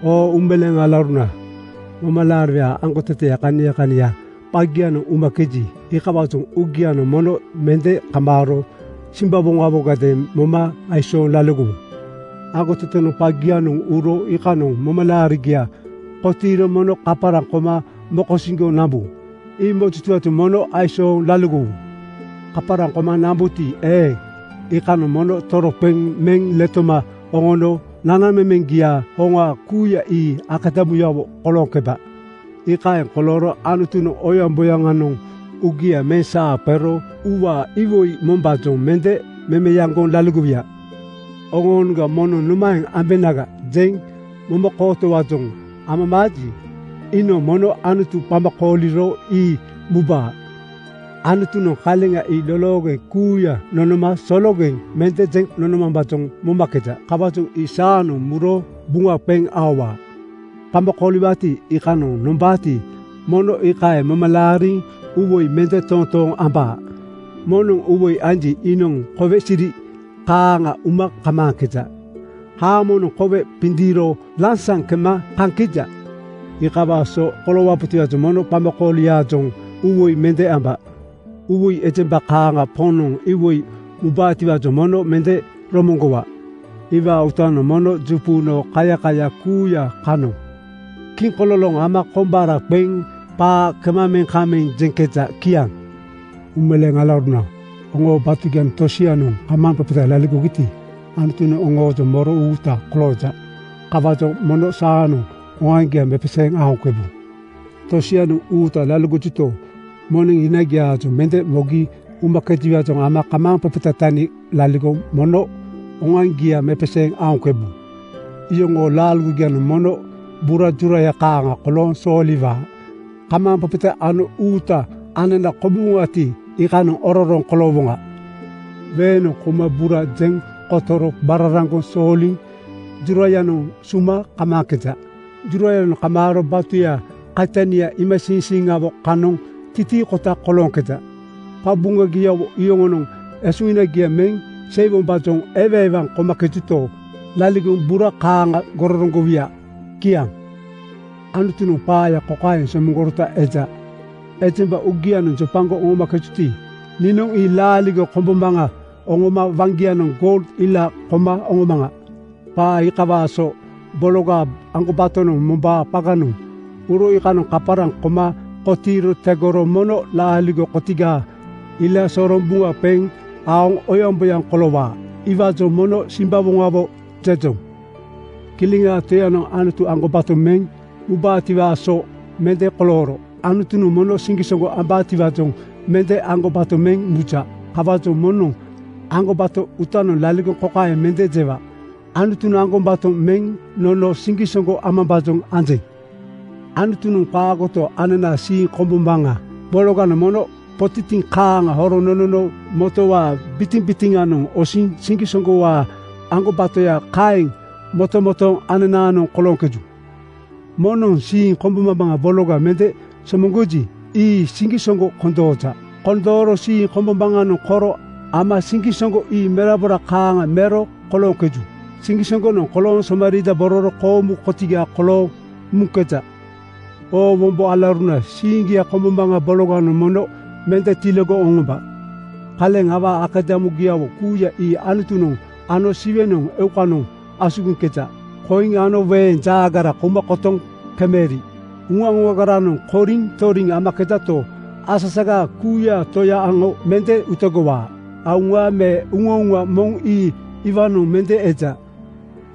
Oo uumeleeŋ alauruna, momalaariwaa aŋgotete kania kania qagianoŋ umakeji, iikawaajoŋ uugianoŋ mono mende kamaaro simbawoŋawogadeeŋ moma aisooŋ laligowu. Aŋgotetenoŋ qagia-noŋ uro iikanoŋ momalaarigia kotiiro mono kaparaŋ koma moko-siŋgoŋ nambu. Ii mojutiwaajoŋ mono aisooŋ laligowu. Kaparaŋ koma nambuti eeŋ, iikanoŋ mono toroqeŋ meŋ letoma oŋono nanamemeŋgiaa hoŋa kuuya ii akadamuyawo kolooŋkebaa. Iikaeŋ kolooro Anutunoŋ oyaŋboyaŋanoŋ uugia meŋ saa qero uuwaa iwoi mombaajoŋ mende memeaŋgoŋ laligowuya. Oŋoonoŋga moŋnoŋ “Nomaeŋ ambenaga?” jeŋ momakootowaajoŋ amamaaji, iinoŋ mono Anutu qama kooliro ii mubaa. Anutunoŋ kaleŋa ii loloogeŋ kuuya nonoma sologeŋ mende jeŋ nonomambaajoŋ momakeja. Kawaajoŋ ii saanoŋ muro buŋa qeŋ aowaa. Qama kooliwaati, iikanoŋ nombaati, mono iikaeŋ moma laariŋ uuwoi mende totooŋ amba. Moŋnoŋ uuwoi anji, iinoŋ kowe siri kaaŋa uma kamaaŋkeja. Haamonoŋ kowe qindiiro lansaŋ kema kaŋkeja. Iikawaa so koloowabotiwaajoŋ mono qamakooliaajoŋ uuwoi mende amba. Uuwoi ejemba kaaŋa Poŋnoŋ iwoi mubaatiwaajoŋ mono mende romoŋgowa. Iwaa uutanoŋ mono juquno kaiyakaya kuuya kanoŋ kiŋkololoŋ ama koŋgbara qeŋ qaa kemameŋ-kaŋmeŋ jeŋkeja. Kiaŋ. Uumeleeŋ alauruna, oŋoo batugianoŋ tosianoŋ kamaaŋqeqeta laligogi Anutunoŋ oŋoojoŋ moro uuta kolooja. Kawaajoŋ mono saanoŋ oŋoaŋgia mepeseeŋ aoŋkebu. Tosianoŋ uuta laligojuto, moneŋ hinagiaajoŋ mende mogi umakejiwaajoŋ ama kamaaŋqeqeta tani laligoŋ mono oŋoaŋgia mepeseeŋ aoŋkebu. Yoŋoo laaligogianoŋ mono bura juraya kaaŋa kolooŋ sooliwaa. Kamaaŋqeqeta ano uuta anana komuwoŋati, iikanoŋ ororoŋ koloowoŋa. Weeŋnoŋ kouma bura jeŋ kotoro qararaŋgoŋ sooliŋ jurayanoŋ suma kamaaŋkeja. Jurayanoŋ kamaaro batuyaa kaitania iimasiiŋsiiŋawo kanoŋ titiikota kolooŋkeja. Qabuŋagiawo yoŋonoŋ esuhinagia meŋ seiwombaajoŋ ewaewaŋ komakejuto, laligoŋ bura kaaŋa gororoŋgowuya. Kiaŋ. Anutunoŋ qaaya kokaeŋ somoŋgorota eja, “Ejemba uugianoŋ jopagoŋ nomakejuti, niinoŋ ii laaligo kombombaŋa oŋoma waŋgianoŋ goul ila koma oŋomaŋa.” Qaa iikawaa so bologaa aŋgobatonoŋ mombaa qaganoŋ uro iikanoŋ kaparaŋ koma kotiiro tegoro mono laaligo kotigaa ila soroŋ buŋa qeŋ aoŋ oyaŋboyaŋ koloowaa. Iwaajoŋ “Mono simbawoŋawo!” jejoŋ. Kileŋaa Toyanoŋ Anutu aŋgobato meŋ mubaatiwaa so mende kolooro Anutunoŋ moŋ siŋgisoŋgo ambaatiwaajoŋ mende aŋgobato meŋ muja. Kawaajoŋ moŋnoŋ aŋgobato uutanoŋ laligoŋ kokaeŋ mende jewa, “Anutunoŋ aŋgobato meŋ nono siŋgisoŋgo amambaajoŋ anjeŋ.” Anutunoŋ qaagoto, ananaa siiŋnana kombombaŋa bologanoŋ mono potitiŋ kaaŋa horoŋ nonono motowaa bitiŋbitiŋanoŋ osiniŋ siŋgisoŋgowaa aŋgobatoya kaeŋ motomotooŋ ananaanoŋ kolooŋkeju. Moŋnoŋ siiŋa kombombaŋa bologa mende somoŋgoji, ii siŋgisoŋgo kondooja. Kondooro siiŋa kombombaŋanoŋ koro ama siŋgisoŋgo ii merabora kaaŋa mero kolooŋkeju. Siŋgisoŋgonoŋ kolooŋ somariidabororo koomu kotiga kolooŋ muŋkeja. Oo wombo alauruna, siiŋgia kombombaŋa bologanoŋ mono mende tiligoŋ oŋomba. Kaleŋ awaa akadamugiawo kuuya ii Anutunoŋ ano Siwe eukanoŋa asugiŋkeja. Koiŋ ano weeŋ jaagara kouma kotoŋ kemeri uŋa-uŋagaranoŋ koriŋ toriŋ amakejato, asa-saga kuuyaa Toya aŋo mende utegowaa. Auŋa me uŋauŋa moŋ ii iwaanoŋ mende eja.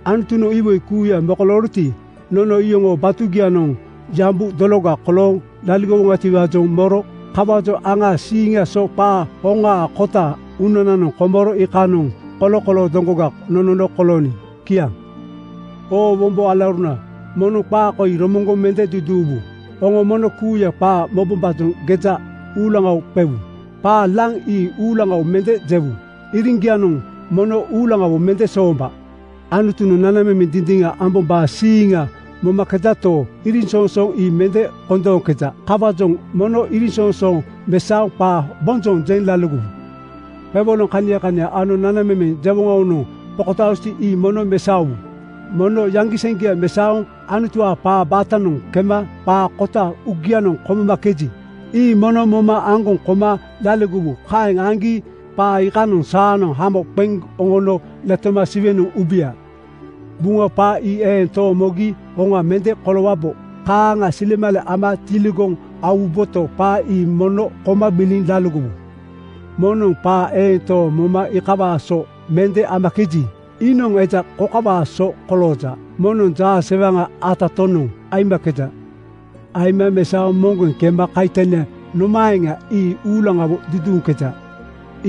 Anutunoŋ iwoi kuuya mokolooroti, nono iyoŋoo batugianoŋ yambu dologa kolooŋ laligowoŋatiwaajoŋ moro. Kawaajoŋ aŋaa siiŋaa so qaa hoŋaa kota uunananoŋ komoro iikanoŋ kolokoloo doŋgoga nonono kolooniŋ. Kiaŋ. Oo wombo alauruna, mono qaa koi romoŋgoŋ mende duduuwu: Oŋo mono kuuya qaa mobombaajoŋ geja uulaŋawo qewu. Qaa laŋ ii uulaŋawo mende jewu. Iriŋgianoŋ mono uulaŋawo mende soomba. Anutunoŋ nanamemeŋ dindiŋa ambombaa siiŋa momakejato, iriŋsoŋsoonoŋ ii mende kondooŋkeja. Kawaajoŋ mono iriŋsoŋsooŋ mesaoŋ qaa bonjoŋ jeŋ laligowu. Qewoloŋ kania kania ano nanamemeŋ jewoŋawonoŋ qokotaajuti, ii mono mesaowu. Mono yaŋgiseŋgia mesaoŋ Anutuwaa qaa baatanoŋ kema qaa kota uugianoŋ komomakeji, ii mono moma aŋgoŋ koma laligowu. Kaeŋ aŋgi qaa iikanoŋ saanoŋ hamo qeŋ oŋono letoma Siwenoŋ ubuya. Buŋa qaa ii eeŋ tooŋ mogi hoŋa mende koloowabo. Kaaŋa silemale ama tiligoŋ aowuboto, qaa ii mono koma gbiliŋ laligowu. Moŋnoŋ qaa eeŋ tooŋ moma iikawaa so mende amakeji, iinoŋ eja kokawaa so kolooja: Moŋnoŋ jaasewaŋa atatonoŋ (jainoŋ) aimakeja. Aima mesaoŋ moŋgeŋ kema kaitania nomaeŋa, ii uulaŋawo duduuŋkeja.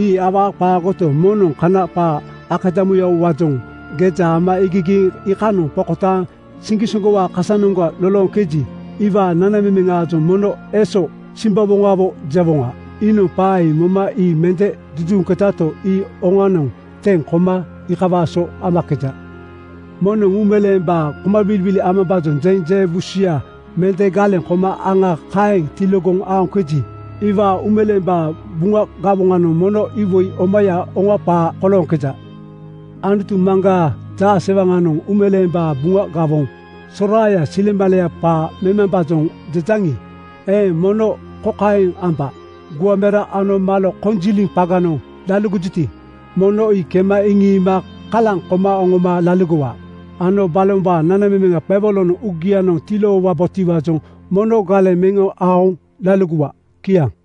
Ii awaa qaagoto, moŋnoŋ kana qaa akadamuyawowaajoŋ geja ama iigigiiŋ iikanoŋ qokotaaŋ siŋgisoŋgowaa kasanoŋga lolooŋkeji, iwaa nanamemeŋaajoŋ mono “Eeso simbawoŋawo!” jewoŋa. Iinoŋ qaa moma ii mende duduuŋkejato, ii oŋanoŋ teŋ koma iikawaa so amakeja. Moŋnoŋ uumeleembaa komagbiligbili amambaajoŋ jeŋ je buu susuya mende galeŋ koma aŋa kaeŋ tiligoŋ aoŋkeji, iwaa uumeleembaa Buŋa gawoŋanoŋ mono iwoi omaya, hoŋa qaa kolooŋkeja. Anutu Maŋgaa jaasewaŋanoŋ uumeleembaa Buŋa gawoŋ soraaya silemaleya qaa memambaajoŋ jejaŋi eeŋ, mono kokaeŋ amba: Guaŋ mera ano malo konjiliŋ qaganoŋ laligojuti, mono ii kema iŋiima kalaŋ koma oŋoma laligowa ano balombaa nanamemeŋaa qewoloŋanoŋ uuga tiloowabotiwaajoŋ mono galeŋ meŋ aoŋ laligowa. Kiaŋ.